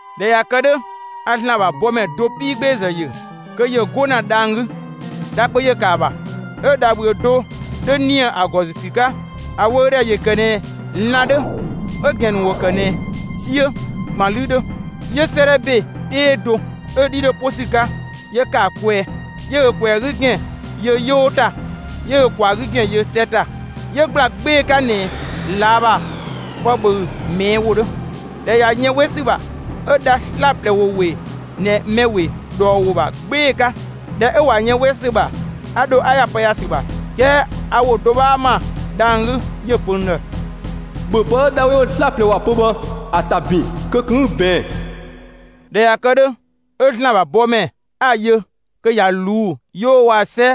꞊Dhɛ ꞊ya kë 'dhö, a ‑Zlan ‑bha bɔmɛ do 'piigbeezë ‑yö, kö ‑yö 'go ‑na dhang‑ 'gü. Dha kpö ‑yö ‑kë ‑a ‑bha, 'ö dhabhüö do 'dho ‑nië ‑a ‑gɔ ‑zü ‑sü 'ka. ‑A wöödhɛ ‑yö ‑kë ꞊nɛ lan‑ 'dhö; 'ö‑ ‑gɛn ‑nu ‑wo ‑kë ꞊nɛ 'siö ꞊gban 'lü 'dhö. 'Yö 'sëëdhɛ ‑be 'tee do 'ö‑ 'dhi 'dho 'po ‑sü 'ka, 'yö ‑kë ‑a kwɛɛ. 'Yö ö ꞊kwɛɛ‑ 'gü ‑gɛn yö 'yoo ‑ta; 'yö ö ꞊kwaa‑ 'gü ‑gɛn yö 'sɛ ‑ta. 'Yö ‑gbla 'gbee‑ 'ka ꞊nɛ ꞊laa' ‑bha pë ꞊bhöü‑ ꞊mɛɛ' ‑wo 'dhö. ꞊Dhɛ ꞊ya yën 'we ‑sü ‑bha, 'ö dha 'slaplɛ ‑wo ‑we ꞊nɛ mɛ ‑we ꞊dhɔɔ ‑wo ‑bha 'gbee‑ 'ka. ꞊Dhɛ 'ö ꞊wa yën 'we ‑sü ‑bha, 'a dho 'a ‑ya pë ‑ya ‑sü ‑bha. 'Kɛɛ a ‑wo do 'bhaa ‑ma dhang‑ 'gü, 'yö‑ pö n ‑dhë: «‑Bhö pë 'ö dha 'we ‑wo 'slaplɛ ‑wa pö bhë, ‑a ‑ta ‑bin; kö ꞊kun 'ü‑ ꞊bɛɛn!» ꞊Dhɛ ꞊ya kë 'dhö, 'ö ‑Zlan ‑bha bɔmɛ 'a‑ yö kö ꞊ya ꞊luu'‑ 'yoo waa‑ 'sɛ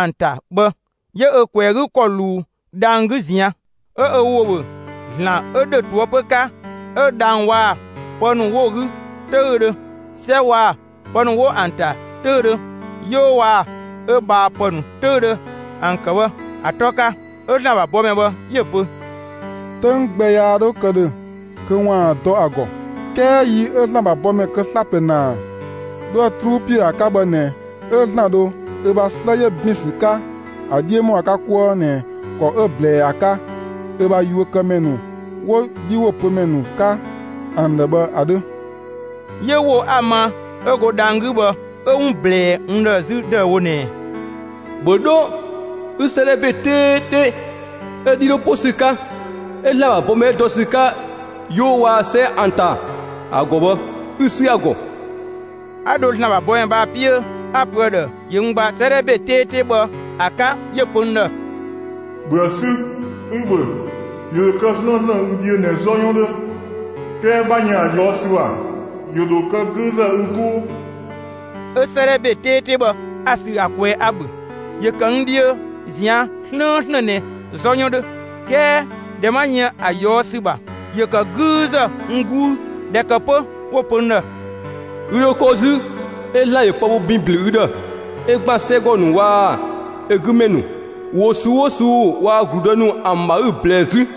‑an ‑ta bhë, 'yö ö ꞊kwɛɛ‑ 'gü ‑kɔ ꞊luu dhang‑ 'gü ꞊zian'. 'Ö ö ‑wo ‑bhö ‑Zlan 'ö ‑dhö ꞊toëpö 'ka, 'ö dhang‑ waa‑ pë ‑nu 'wo‑ 'gü 'töüdhö, 'sɛ waa‑ pë ‑nu 'wo ‑an ‑ta 'töüdhö, 'yoo waa‑ ö ꞊bhaapë ‑nu 'töüdhö ‑an ‑kë bhë ‑a 'tɔ 'ka. 'Ö ‑Zlan ‑bha bɔmɛ bhë 'yö‑ pö: «'Töng gbɛ yaa 'dho kë ‑dhö kö ‑waan dɔ ‑a ‑gɔ. 'Kɛɛ yi 'ö ‑Zlan ‑bha bɔmɛ kë 'slaplɛ ‑naa 'dhoë‑ 'truu ‑piö ‑a 'ka bhë ꞊nɛ 'ö ‑Zlan dho ö bha 'slë 'yö ‑bin ‑sü 'ka ‑a 'dhiö ‑mɔ ‑a 'ka 'kuë ꞊nɛ ‑kɔ 'ö‑ ꞊blɛɛ ‑a 'ka ö bha yuökëmɛ ‑nu 'wo‑ 'dhiwopömɛ ‑nu 'ka ‑an ‑dhë bhë ‑a 'dhö.» 'Yö ‑wo 'a‑ ma 'ö go dhang‑ 'gü bhë, 'ö 'wun ꞊blɛɛ n ‑dhë 'zü ‑dëüwo ꞊nɛɛ: «‑Bhö 'dho 'ü 'sëëdhɛ ‑be 'teete 'ö‑ 'dhi 'dho 'po ‑sü 'ka, 'ö ‑Zlan ‑bha bɔmɛ mɛ 'ö dɔ ‑sü 'ka 'yoo waa‑ 'sɛ ‑an ‑ta ‑a ‑gɔ bhë, 'ü‑ 'sü ‑a ‑gɔ!» 'A dho ‑Zlan ‑bha bɔmɛ bhë ‑a 'piö 'a‑ pö ‑a ‑dhë ‑yö n gbaa 'sëëdhɛ ‑be 'teete bhë ‑a 'ka; 'yö‑ pö n ‑dhë: «‑Bhöë 'sü, 'ü‑ ‑bhö! ‑Yö ‑dho kë 'slëënslën ü dhiö ꞊nɛ 'zɔ 'yɔn 'dhö, 'kɛɛ 'bha yën ‑a ꞊yɔɔ' ‑sü ‑bha, ‑yö ‑dho kë 'güüzë ü 'guu.» 'Ö 'sëëdhɛ ‑be 'teete bhë, 'a‑ sü ‑a kwɛɛ, 'a‑ ‑bhö. ‑Yö ‑kë n dhiö ꞊zian' 'slëënslën ꞊nɛ 'zɔ 'yɔn 'dhö; 'kɛɛ ꞊dhɛ 'ma yën ‑a ꞊yɔɔ' ‑sü ‑bha, ‑yö ‑kë 'güüzë n 'guu. ꞊Dhɛ ‑kë 'pö 'wo‑ pö n ‑dhë: «Ü ‑dho ko 'zü 'ö ‑Zlan ‑yö pë bho ‑bin ‑blü ü ‑dhë, 'ö ‑gban 'sɛgɔ ‑nu waa‑ ö 'gü ‑mɛ ‑nu, ‑wo ꞊suu'‑ 'oo ꞊suu'‑ waa‑ ‑gludë ‑nu ‑an ‑bha 'ü‑ ꞊blɛɛ 'zü.»